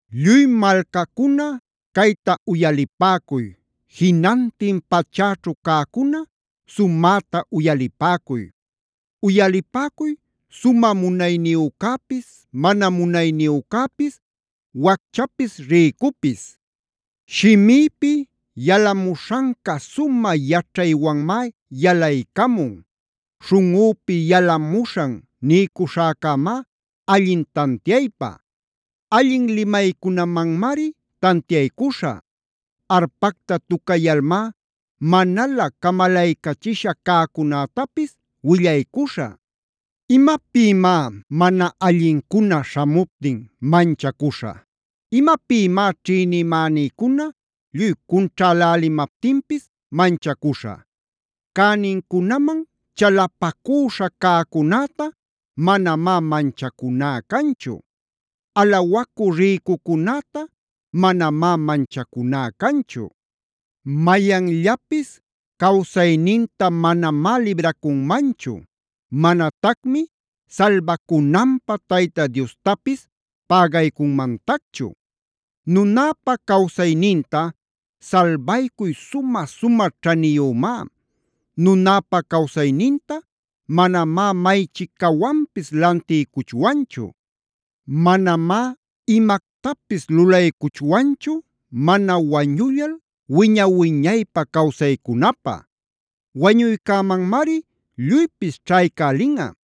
Lluy malcacuna cayta uyalipäcuy. Jinantin pachäćhu cäcuna sumäta uyalipäcuy. Uyalipäcuy sumä munayniyücäpis mana munayniyücäpis, wacchapis rïcupis. Shimïpi yalamuśhanca sumä yaćhaywanmá yalaycamun. Śhunꞌüpi yalamuśhan niycuśhäcämá allin tantiaypä. Allin limaycunamanmari tantiaycuśhä. Arpacta tucayalmá manalä camalaycachisha cäcunätapis willaycuśhä. ¿Imapïmá mana allincuna śhamuptin manchacuśhä? ¿Imapïmá ćhïnimänïcuna lluy cunćhälälimaptinpis manchacuśhä? Cänincunaman chalapacüśha cäcunäta manamá manchacuná canchu. Alawacü rïcucunäta manamá manchacuná canchu. Mayanllapis cawsayninta manamá libracunmanchu. Manatacmi salbacunanpä Tayta Diostapis pägaycunmantacchu. Nunäpa cawsayninta salbaycuy sumä-sumä ćhaniyumá. Nunäpa cawsayninta manamá maychicawanpis lantiycuchwanchu. Manamá imactapis lulaycuchwanchu mana wañullal wiña-wiñaypä cawsaycunapä. Wañuycämanmari lluypis ćhaycälinꞌa.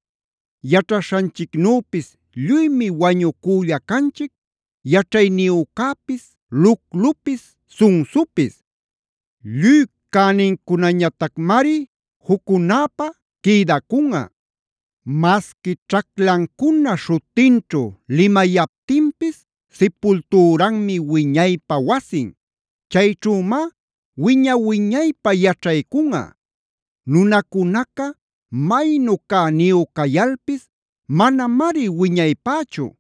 Yaćhaśhanchicnüpis lluymi wañucülla canchic yaćhayniyücäpis, luclupis, sunsupis. Lluy cänincunañatacmari juccunapä quïdacunꞌa. Masqui ćhaclancuna śhutinćhu limayaptinpis sipultüranmi wiñaypä wasin. Chayćhümá wiña-wiñaypä yaćhaycunꞌa. Nunacunaca maynu cäniyu cayalpis manamari wiñaypächu.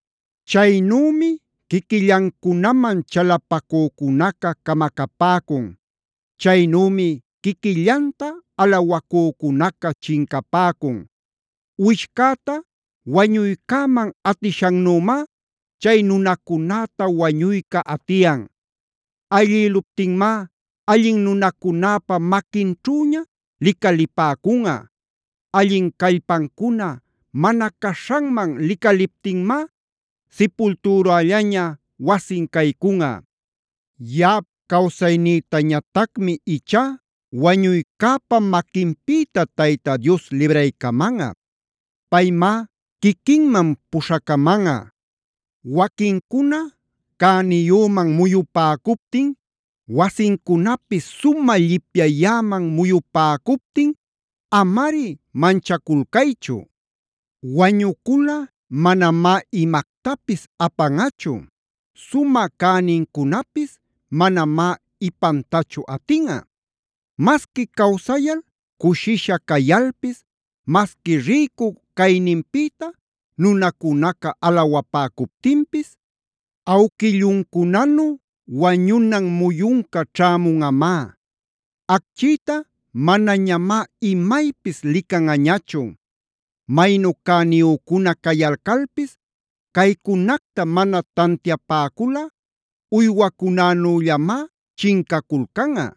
Chaynümi quiquillancunaman chalapacücunaca camacapäcun. Chaynümi quiquillanta alawacücunaca chincapäcun. Uwishcäta wañuycäman atishannümá chay nunacunäta wañuyca atiyan. Ayllïluptinmá allin nunacunäpa maquinćhüña licalipäcunꞌa. Allin callpancuna mana caśhanman licaliptinmá sipultürällaña wasin caycunꞌa. Yaꞌap cawsaynïtañatacmi ichá wañuycäpa maquinpïta Tayta Dios libraycamanꞌa. Paymá quiquinman puśhacamanꞌa. Waquincuna cäniyüman muyupäcuptin, wasincunapis sumä llipyayäman muyupäcuptin amari manchaculcaychu. Wañuculꞌa manamá imactapis apanꞌachu.b Sumä cänincunapis manamá ipantachu atinꞌa. Masqui cawsayal cushisha cayalpis, masqui rïcu cayninpïta nunacunaca alawapäcuptinpis, awquilluncunanu wañunan muyunca ćhämunꞌamá. Acchïta manañamá imaypis licanꞌañachu. Maynu cäniyücuna cayalcalpis caycunacta mana tantiapäculꞌa uywacunanüllamá chincaculcanꞌa.